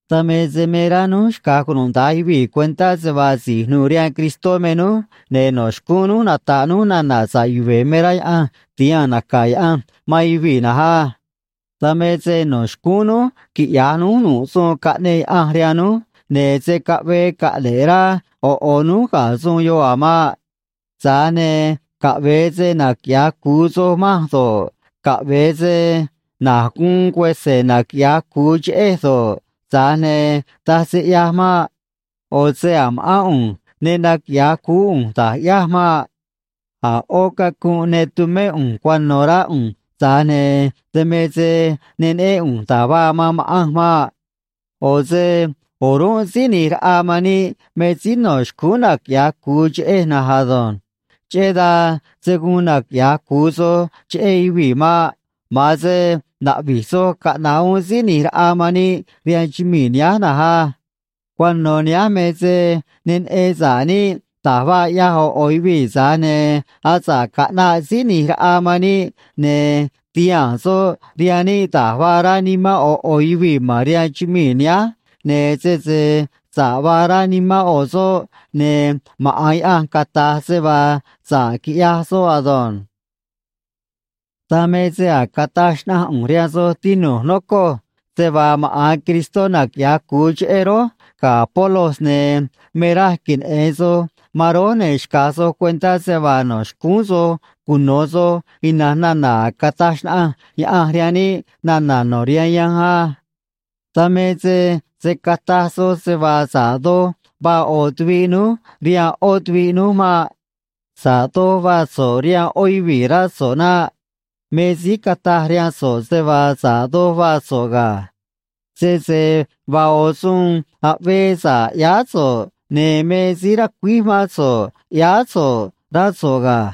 Dan me se me rá núj xca̱j cunuda̱nj yuvii̱ cuentá se vaa si̱j nu̱u̱ rihaan Cristó me núj, ne̱ no̱ xcúún núj nata̱ꞌ núj nana̱ sa̱ꞌ yuve̱ me rá Yaꞌanj ti̱haa̱n naca̱ Yaꞌanj man yuvii̱ na̱nj á. Dan me se no̱ xcúún núj quiꞌya̱j núj nu̱ꞌ suun caꞌneꞌ Yaꞌanj rihaan núj, ne̱ se̱ caꞌvee caꞌne̱ꞌ rá ꞌo̱ ꞌo̱ núj ga̱ suun yoꞌ a̱ maꞌ. Tza̱j ne̱ caꞌve̱e se naquiꞌya̱j cu̱u soj manj do̱ꞌ, caꞌve̱e se na̱j guun cuese̱ naquiꞌya̱j cu̱u cheꞌej do̱ꞌ, tza̱j ne̱ taj se ꞌyaj maꞌ. ꞌO̱ se a̱ ma̱ꞌán ꞌu̱nj ne naquiꞌya̱j cuú ꞌu̱nj da̱j ꞌyáj maꞌ. A̱ ꞌó cacunꞌ ne tumé ꞌu̱nj cuano̱, rá ꞌu̱nj, tza̱j ne̱ dan me se ne neꞌén ꞌu̱nj da̱j vaa man ma̱ꞌanj maꞌ. ꞌO̱ se o̱rúnꞌ Síí ꞌNi̱j Raꞌa man níꞌ me síí no̱ xcúún naquiꞌya̱j cu̱u cheꞌej na̱nj ado̱nj. Cheꞌé dan se̱ guun naquiꞌya̱j cu̱u soj cheꞌé yuvii̱ maꞌ. Ma̱an se na̱ꞌvi̱j soj caꞌna̱ꞌ uún Síí ꞌNi̱j Raꞌa man níꞌ rihaan chumii̱ nihánj na̱nj á. Cuano̱ nihánj me se ne neꞌen sa̱ꞌ níꞌ da̱j vaa ꞌyaj ꞌo̱ ꞌo̱ yuvii̱, tza̱j ne̱ asa̱ꞌ caꞌnaꞌ Síí ꞌNi̱j Raꞌa man níꞌ, ne̱ ti̱haa̱n soꞌ rihaan níꞌ da̱j vaa rá nimán ꞌo̱ ꞌo̱ yuvii̱ ma̱n rihaan chumii̱ nihánj, ne̱ sese sa̱ꞌ vaa rá nimán ꞌo̱ soꞌ, ne̱ maꞌa̱n Yaꞌanj cata̱j se vaa sa̱ꞌ quiꞌyaj soꞌ ado̱nj. Dan me se a̱j cataj xnaꞌanj ꞌu̱nj rihaan soj, tinu̱j, nocoj, se vaa maꞌa̱n Cristó naquiꞌya̱j cu̱u cheꞌé rój ga̱ Apolos, ne̱ me raj queneꞌe̱n soj man rój, ne̱ xca̱j soj cuentá se vaa no̱ xcúún soj cuno̱ soj ina̱nj nana̱ a̱j cataj xnaꞌanj Yaꞌanj rihaan níꞌ nana̱ no̱ rihaan yanj á. Dan me se se̱ cataj soj se vaa sa̱ꞌ doj vaa ꞌo̱ tuviꞌ núj rihaan ꞌó tuviꞌ núj maꞌ. Sa̱ꞌ doj vaa so̱ꞌ rihaan ꞌó yuvii̱, rá so̱ꞌ naꞌ. Me síí cataj rihaan so̱ꞌ se vaa sa̱ꞌ doj vaa so̱ꞌ ga̱. Sese vaa ꞌo̱ suun aꞌvee sa̱ꞌ ꞌyáá so̱ꞌ, ne̱ me síí racuíj mán so̱ꞌ ꞌyáá so̱ꞌ, rá so̱ꞌ ga̱.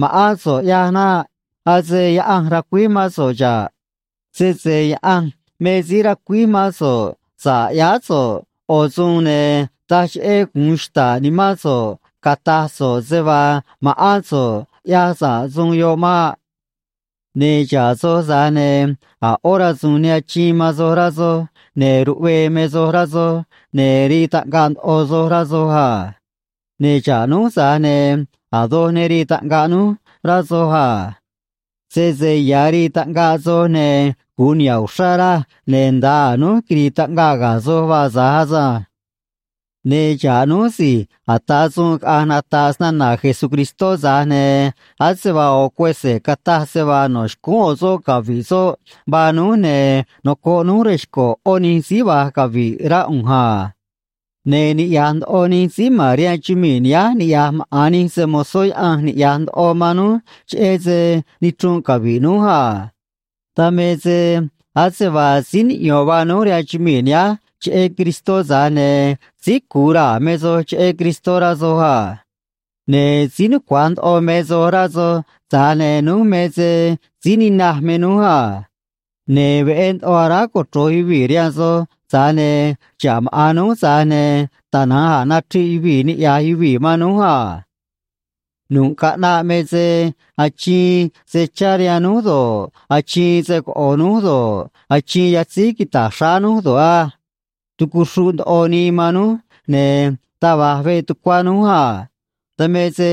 Ma̱ꞌán so̱ꞌ ꞌyaj naꞌ. Ase Yaꞌanj racuíj mán so̱ꞌ xa̱ꞌ. Sese Yaꞌanj me síí racuíj mán so̱ꞌ sa̱ꞌ ꞌyáá so̱ꞌ ꞌo̱ suun, ne̱ taj cheꞌé gu̱un xta̱ꞌ nimán so̱ꞌ cata̱j so̱ꞌ se vaa ma̱ꞌán so̱ꞌ ꞌyaj sa̱ꞌ suun yoꞌ maꞌ. Ne̱ xa̱ꞌ soj, tza̱j ne̱ a̱ ꞌó rasu̱u̱n ne achiin man soj, rá soj, ne̱ ruꞌvee me soj, rá soj, ne̱ rii taꞌngaꞌ ndoꞌo soj, rá soj a. Ne̱ xa̱ꞌ núj, tza̱j ne̱ a̱ doj ne rii taꞌngaꞌ núj, rá soj a. Sese ya̱ rii taꞌngaꞌ soj, ne̱ gu̱un niha̱ꞌ uxrá raj, ne̱ nda̱a a̱ núj quiri̱i̱ taꞌngaꞌ ga̱ soj vaa tza̱j asanj. Ne̱ xa̱ꞌ núj si̱j ata̱ suun caꞌa̱nj nata̱ꞌ snana̱ Jesucristó, tza̱j ne̱ ase vaa ꞌo̱ juese̱ cataj se vaa no̱ xcúún ꞌo̱ soꞌ cavi̱ꞌ soꞌ vaa núj, ne̱ nocoꞌ núj rej xco̱ ꞌó nij síí va̱j cavi̱ꞌ rá ꞌu̱nj a. Ne̱ niꞌya̱j ndoꞌo nij síí ma̱n rihaan chumii̱ nihánj niꞌya̱j maꞌa̱n nij se‑mo̱zó Yaꞌanj niꞌya̱j ndoꞌo man núj cheꞌé se nichrunꞌ cavi̱ꞌ núj a. Dan me se ase vaa síí niꞌyo̱n vaa núj rihaan chumii̱ nihánj, cheꞌé Cristó, tza̱j ne̱ síí cu̱u raa̱ me soj cheꞌé Cristó, rá soj a. Ne̱ síí nucua̱j ndoꞌo me soj, rá soj, tza̱j ne̱ núj me se síí ninaj me núj a. Ne̱ veꞌé ndoꞌo aráj cochro̱j yuvii̱ rihaan soj, tza̱j ne̱ xa̱ꞌ maꞌa̱n núj, tza̱j ne̱ tana̱nj a̱ nachriꞌ yuvii̱ niꞌya̱j yuvii̱ man núj a. Nu̱ꞌ caꞌnaꞌ me se achiin se chá rihaan núj do̱ꞌ, achiin se coꞌo̱ núj do̱ꞌ, achiin yatzíj quita̱j xráá núj do̱ꞌ á. Tucuxruꞌ ndoꞌo nii man núj, ne̱ taj va̱j veꞌ tucuá núj a. Dan me se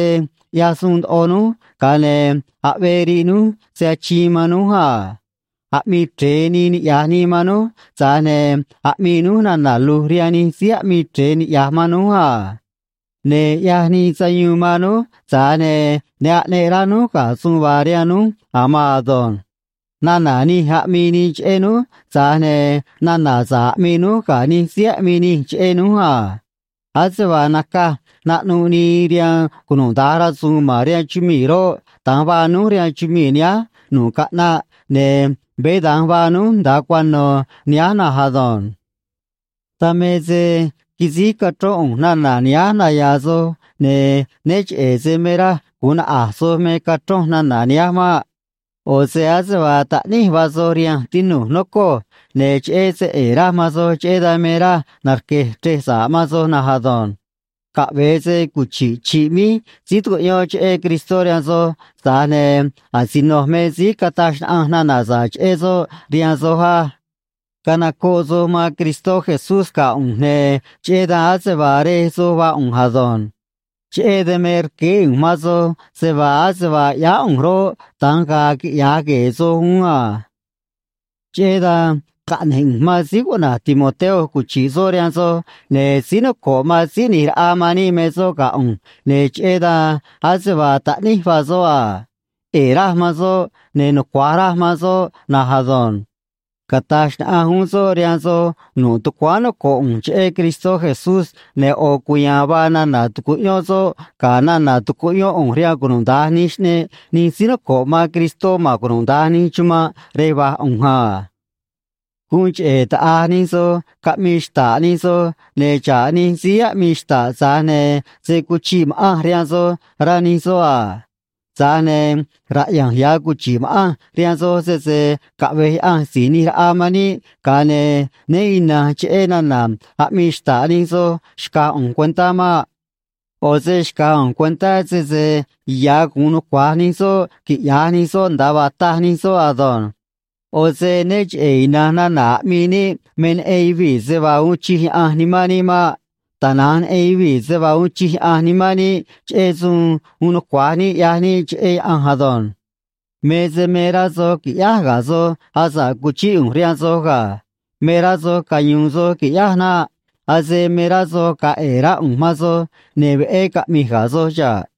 ꞌyaj suun ndoꞌo núj, ga̱a ne̱ aꞌvee riꞌ núj se achiin man núj a. Aꞌmii chre̱e nii niꞌya̱j nii man núj, tza̱j ne̱ aꞌmii núj nana̱ lu̱j rihaan nij síí aꞌmii chre̱e niꞌya̱j man núj a. Ne̱ ꞌyaj nii sayuun man núj, tza̱j ne̱ ne aꞌneꞌ rá núj ga̱ suun vaa rihaan núj a̱ maan ado̱nj. Nana̱ nij aꞌmii nii cheꞌé núj, tza̱j ne̱ nana̱ sa̱ꞌ aꞌmii núj ga̱ nij síí aꞌmii nij cheꞌé núj a. Ase vaa nacaj naꞌnuꞌ nii rihaan cunuda̱nj rasu̱u̱n ma̱n rihaan chumii̱ roꞌ, da̱nj vaa núj rihaan chumii̱ nihánj nu̱ꞌ caꞌnaꞌ, ne̱ veé da̱nj vaa núj nda̱a cuano̱ nihánj na̱nj ado̱nj. Dan me se quisíj cachrón ꞌu̱nj nana̱ nihánj naya̱a̱ soj, ne̱ né cheꞌe̱ se me raj gu̱un naꞌa̱j soj me cachronj nana̱ nihánj maꞌ. ꞌO̱ se ase vaa taꞌníj vaa soj rihanj, tinu̱j, nocoj, ne̱ cheꞌé se ꞌe̱e̱ raj man soj, cheꞌé dan me raj narque̱j chrej sa̱ꞌ man soj na̱nj ado̱nj. Caꞌve̱e se cuchi̱ꞌ chi̱ꞌ míj síí tu̱cuꞌyón cheꞌé Cristó rihaan soj, tza̱j ne̱ asinoj me síí cataj xnaꞌanj nana̱ sa̱ꞌ cheꞌé soꞌ rihaan soj á. Canocoꞌ soj man Cristó Jesús ga̱ ꞌu̱nj, ne̱ cheꞌé dan ase vaa rej soj vaa ꞌu̱nj ado̱nj. Cheꞌé dan me rqueé ꞌu̱nj man soj se vaa ase vaa ꞌyáá ꞌu̱nj roꞌ, da̱nj ga̱a̱ quiꞌya̱j gue̱e̱ soj uún a. Cheꞌé dan caꞌne̱j ꞌu̱nj man síí cuꞌna̱j Timoteo cuchi̱ꞌ soꞌ rihaan soj, ne̱ síí noco̱ꞌ man Síí ꞌNi̱j Raꞌa man níꞌ me soꞌ ga̱ ꞌu̱nj, ne̱ cheꞌé dan ase vaa taꞌníj vaa soꞌ a. ꞌE̱e̱ raj man soꞌ, ne̱ nucua̱j raj man soꞌ na̱nj ado̱nj. Cata̱j xnaꞌanj uún soꞌ rihaan soj nu̱ꞌ tucuáán noco̱ꞌ ꞌu̱nj cheꞌé Cristó Jesús, ne̱ ꞌo̱ cuya̱a̱n vaa nana̱ tu̱cuꞌyón soꞌ ga̱ nana̱ tucuꞌyón ꞌu̱nj rihaan cunuda̱nj nij xꞌneꞌ nij síí noco̱ꞌ man Cristó ma̱n cunuda̱nj nij chumanꞌ rej va̱j ꞌu̱nj a. Guun cheꞌe̱ taꞌa̱j nij soj caꞌmii xta̱ꞌ nij soj, ne̱ xa̱ꞌ nij síí aꞌmii xta̱ꞌ, tza̱j ne̱ se̱ cuchiꞌ ma̱ꞌanj rihaan soj, rá nij soꞌ a. Tza̱j ne̱ raꞌya̱nj ya̱ cuchi̱ꞌ ma̱ꞌanj rihaan soj, sese caꞌve̱j Yaꞌanj Si̱j ꞌNi̱j Raꞌa man níꞌ, ga̱a ne̱ né ina̱nj cheꞌé nana̱ aꞌmii xta̱ꞌ nij soꞌ xca̱j ꞌu̱nj cuentá maꞌ. ꞌO̱ se xca̱j ꞌu̱nj cuentá sese ya̱ gu̱un nucua̱j nij soꞌ quiꞌya̱j nij soꞌ nda̱a vaa taj nij soꞌ ado̱nj. ꞌO̱ se né cheꞌe̱ ina̱nj nana̱ aꞌmii níꞌ me neꞌen yuvii̱ se vaa uun chij Yaꞌanj nimán níꞌ maꞌ. Tana̱nj neꞌen yuvii̱ se vaa uun chij Yaꞌanj nimán níꞌ cheꞌé suun uun nucua̱j níꞌ ꞌyaj níꞌ cheꞌé Yaꞌanj ado̱nj. Me se me rá soj qui̱ꞌyáj ga̱ soj asa̱ꞌ cuchíꞌ ꞌu̱nj rihaan soj ga̱. Me rá soj cayu̱u̱n soj qui̱ꞌyáj naꞌ. Ase me rá soj ga̱a̱ ꞌe̱e̱ rá ꞌu̱nj man soj ne̱ veꞌé caꞌmi̱j ga̱ soj xa̱ꞌ.